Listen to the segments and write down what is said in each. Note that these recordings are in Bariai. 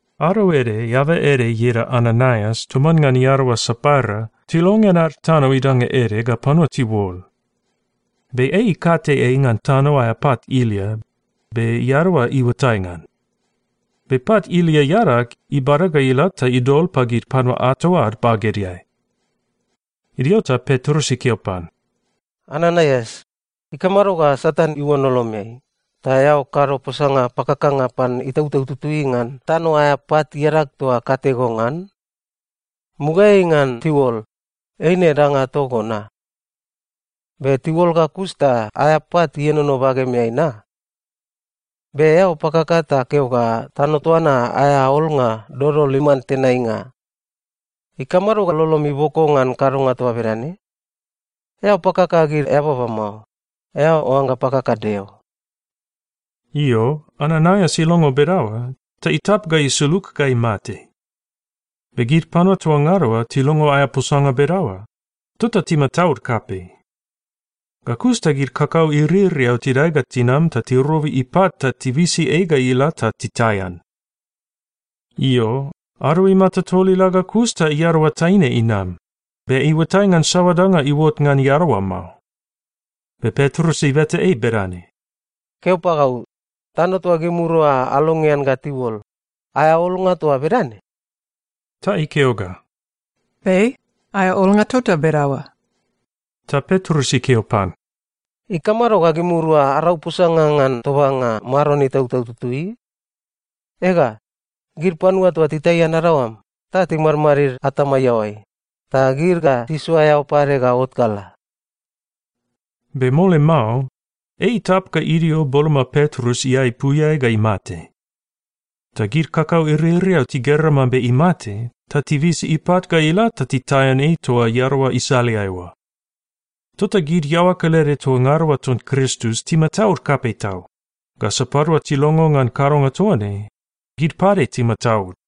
Ado ede, eaba ede ieda Ananaias toman ngan iadaoa Sapaira tilongean ad tano idanga ede ga panua tiuol. Be ei ikate ei ngan tano aea pat ilia, be iadaoa iuatai ngan. Be pat ilia iadag, ibada ga ila ta idol pagid panua ato ad bagedeai. Idio ta Petrus ikeo pan, “Ananaias, ikamado ga Satan iuon lolomeai, ta eao kado posanga pakakanga pan Itautau Tutui ngan tano aea pat iadag toa kate go ngan? Mugaeai ngan tiuol, eine danga togo na? Be tiuol ga kus ta aea pat ienono bagemeai na? Be eao pakaka ta keo ga tano toa na aea olnga dodol iman tenainga. Ikamado ga lolom iboko ngan kadonga toa bedane? Eao pakaka gid eababa mao. Eao oangga pakaka Deo.” Io, Ananaias ilongo bedaoa, ta itap ga isulug ga imate. Be gid panua toa ngada oa tilongo aea posanga bedaoa, tota timataud kapei. Ga kus ta gid kakau iririau tidae ga tinam ta tirobi ipat ta tibisi ei ga ila ta titaian. Io, ado imata tol ila ga kus ta iadaoa taine inam, be iuatai ngan saoa danga iuot ngan iadaoa mao. Be Petrus ibeta ei bedane, “Keo pagau, tano toa gimirua alongean ga tiuol, aea olnga toa bedane?” Ta ikeo ga, “Be. Aea olnga tota bedaoa.” Ta Petrus ikeo pan, “Ikamado ga gimirua arau posanga ngan tobanga Maron Itautau Tutui? Ega, gid panua toa titaian adaoam, ta timadmadid atama iaoai, ta gid ga tisoa eao pade ga ot ga la.” Be mole mao, ei itap ga idio boloma Petrus iaepuiai ga imate. Ta gid kakau iririau tigera mambe imate, ta tibisi ipat ga ila ta titaian ei toa iadaoa isaleai oa. Tota gid iaoa kelede toa ngada oa ton Kristus timataud kapei tau, ga sapadua tilongo ngan kadonga toa ne, gid pade timataud.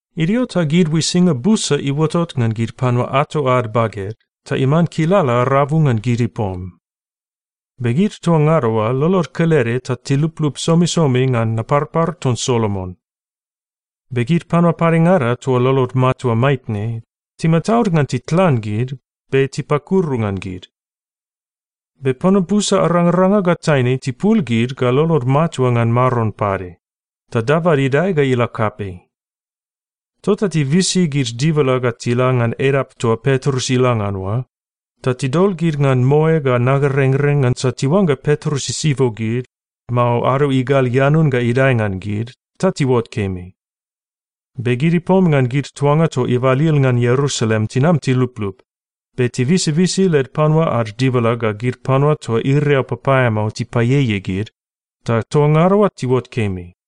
Idio ta gid uisinga busa iuotot ngan gid panua ato ad baged ta iman kilala rabu ngan gid ipom. Be gid toa ngada oa lolod kelede ta tiluplup somisomi ngan Naparpar ton Solomon. Be gid panua padengada toa lolod matua maitne, timataud ngan titlan gid, be tipakuru ngan gid. Be panua busa arangaranga ga taine tipul gid ga lolod matua ngan Maron pade, ta dabad idae ga ila kapei. Tota tibisi gid dibala ga tila ngan edap toa Petrus ila ngan oa, ta tidol gid ngan moe ga nagarengreng, ngansa tiuangga Petrus isibo gid, mao ado igal ianun ga idae ngan gid, ta tiuot kemi. Be gid ipom ngan gid tuanga toa ibalil ngan Ierusalem tinam tiluplup, be tibisibisi led panua ad dibala ga gid panua toa iriau papaeamao tipaieiei gid, ta toa ngada oa tiuot kemi.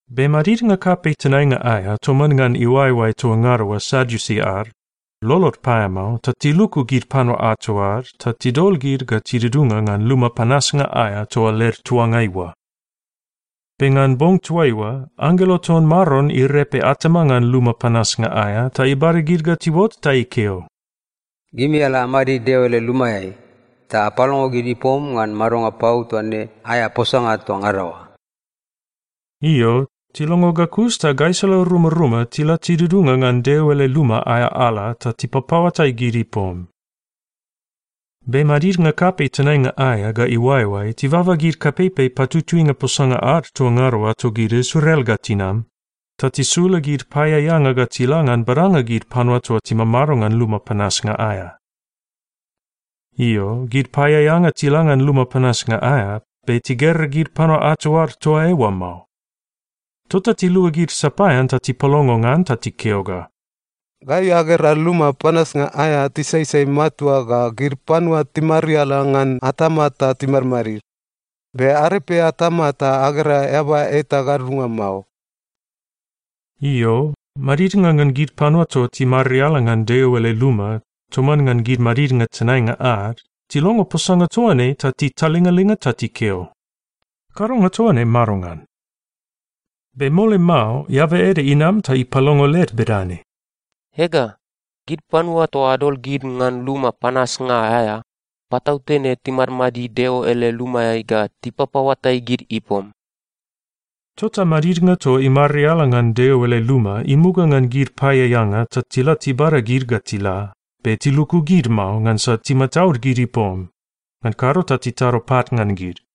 Be madidnga kapei tenainga aea toman ngan iuaeoae toa ngada oa Sadiusi ad, lolod paeamao ta tiluku gid panua ato ad ta tidol gid ga tidudunga ngan luma panasnga aea toa led tuangai oa. Be ngan bong toaiua, anggelo ton Maron irepe atama ngan luma panasnga aea ta ibada gid ga tiuot ta ikeo, “Gimi ala amadid Deo ele lumaeai, ta apalongo gid ipom ngan madonga pau toa ne aea posanga toa ngada oa.” Io, tilongo ga kus ta gaisala rumaruma tila tidudunga ngan Deo ele luma aea ala ta tipapaoatai gid ipom. Be madidnga kapei tenainga aea ga iuaeoae tibaba gid kapeipei patutuinga posanga ad toa ngada oa togid Israel ga tinam, ta tisula gid paeaeanga ga tila ngan badanga gid panua toa timamado ngan luma panasnga aea. Io, gid paeaeanga tila ngan luma panasnga aea, be tigera gid panua ato ad toa eoa mao. Tota tiluagid sapaean ta tipalongo ngan ta tikeo ga, “Gai agera luma panasnga aea tisaisai matua ga gid panua timariala ngan atama ta timadmadid, be arepe atama ta agera eaba eta gadudunga mao.” Io, madidnga ngan gid panua toa timariala ngan Deo ele luma toman ngan gid madidnga tenainga ad, tilongo posanga toa ne ta titalingalinga ta tikeo, “Kadonga toa ne madongan?” Be mole mao, eaba ede inam ta ipalongo led bedane, “Ega, gid panua toa adol gid ngan luma panasnga aea, patautene timadmadid Deo ele lumaeai ga tipapaoatai gid ipom!” Tota madidnga toa imariala ngan Deo ele luma imuga ngan gid paeaeanga ta tila tibada gid ga tila, be tiluku gid mao, ngansa timataud gid ipom, ngan kado ta titado pat ngan gid.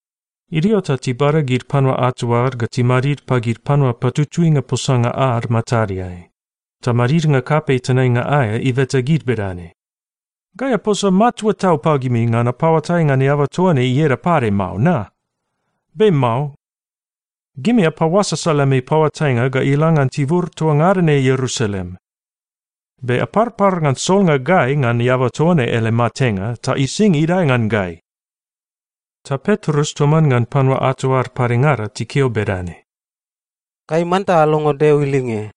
Idio ta tibada gid panua ato ad ga timadid pagid panua patutuinga posanga ad matadeai, ta madidnga kapei tenainga aea ibeta gid bedane, “Gai aposa matua tau pagimi ngan apaoatai ngan eaba toa ne ieda pade mao na? Be mao. Gimi apaoasasa lemi paoatainga ga ila ngan tibur toa ngada ne Ierusalem. Be aparpar ngan solnga gai ngan eaba toa ne ele matenga ta ising idae ngan gai.” Ta Petrus toman ngan panua ato ad padengada tikeo bedane, “Gai manta alongo Deo ilinge,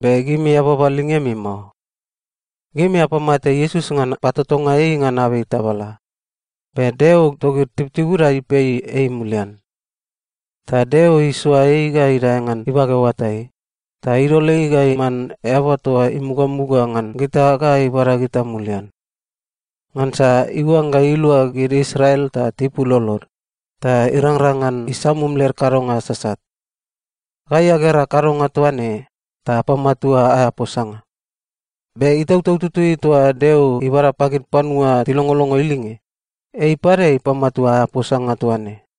be gimi eababa lingemi mao. Gimi apamate Iesus ngan patotonga ei ngan abei tabala, be Deo togid tibutibuda ipei ei mulian. Ta Deo isoa ei ga idae ngan ibage oatai, ta idol ei ga iman eaba toa imugamuga ngan gita ga ibada gita mulian. Ngansa iuangga ilua gid Israel ta tipul lolod, ta irangrang ngan isamum led kadonga sasat. Gai agera kadonga toa ne, ta apamatua aea posanga. Be Itautau Tutui toa Deo ibada pagid panua tilongolongo ilinge, ei pade ipamatua aea posanga toa ne.”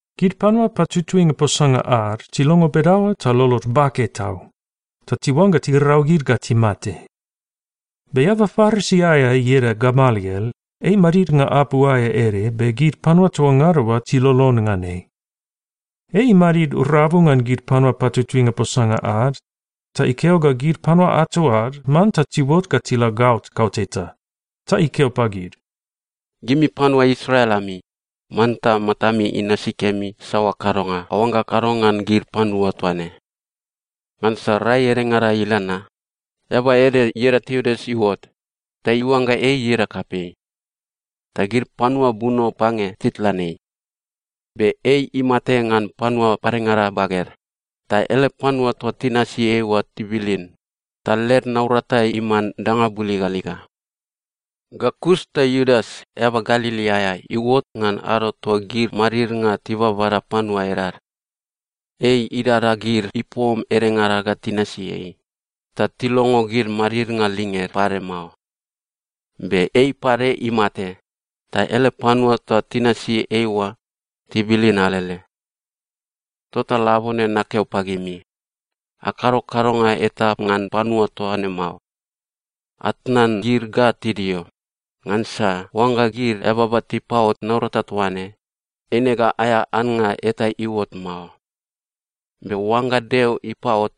Gid panua patutuinga posanga ad tilongo bedaoa ta lolod bake tau, ta tiuangga tirau gid ga timate. Be eaba Parisi aea ieda Gamaliel, ei madidnga apu aea ede be gid panua toa ngada oa tilolon ngan ei. Ei imadid rabu ngan gid panua patutuinga posanga ad, ta ikeo ga gid panua ato ad manta tiuot ga tila gaot kauteta. Ta ikeo pagid, “Gimi panua Israel ami, manta matami inasi kemi saoa kadonga aoangga akado ngan gid panua toa ne. Ngansa rai edengada ila na, eaba ede ieda Teudas iuot, ta iuangga ei ieda kapei. Ta gid panua buno pange titlan ei. Be ei imate ngan panua padengada baged, ta ele panua toa tinasi ei oa tibilin, ta led naurata iman danga buligaliga. Ga kus ta Iudas, eaba Galili aea iuot ngan ado toa gid madidnga tibabada panua edad. Ei idada gid ipom edengada ga tinasi ei, ta tilongo gid madidnga linged pade mao. Be ei pade imate, ta ele panua toa tinasi ei oa, tibilin alele. Tota labone nakeo pagimi, akado kadonga eta ngan panua toa ne mao. Atnan gid ga tidio, ngansa oangga gid eababa tipaot naurata toa ne, eine ga aea annga eta iuot mao. Be oangga Deo ipaot,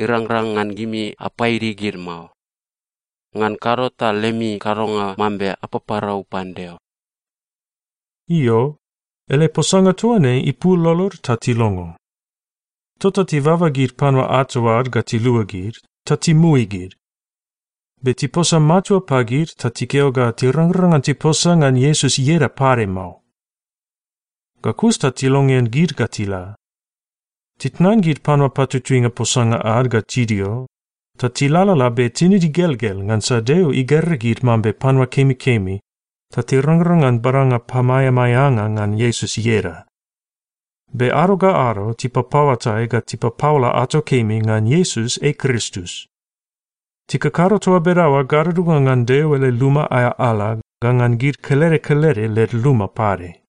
irangrang ngan gimi apaidi gid mao. Ngan kado ta lemi kadonga mambe apaparau pan Deo.” Io, ele posanga toa ne ipul lolod, ta tilongo. Tota tibaba gid panua ato ad ga tiluagid, ta timui gid. Be tiposa matua pagid ta tikeo ga tirangrang ngan tiposa ngan Iesus ieda pade mao. Ga kus ta tilongean gid ga tila. Titnan gid panua patutuinga posanga ad ga tidio, ta tilalala be tinid igelgel ngansa Deo igera gid mambe panua kemikemi, ta tirangrang ngan badanga pamaeamaeanga ngan Iesus ieda. Be ado ga ado tipapaoatai ga tipapaola ato kemi ngan Iesus ei Kristus. Tikakado toa bedaoa gadudunga ngan Deo ele luma aea ala ga ngan gid kelede kelede led luma pade.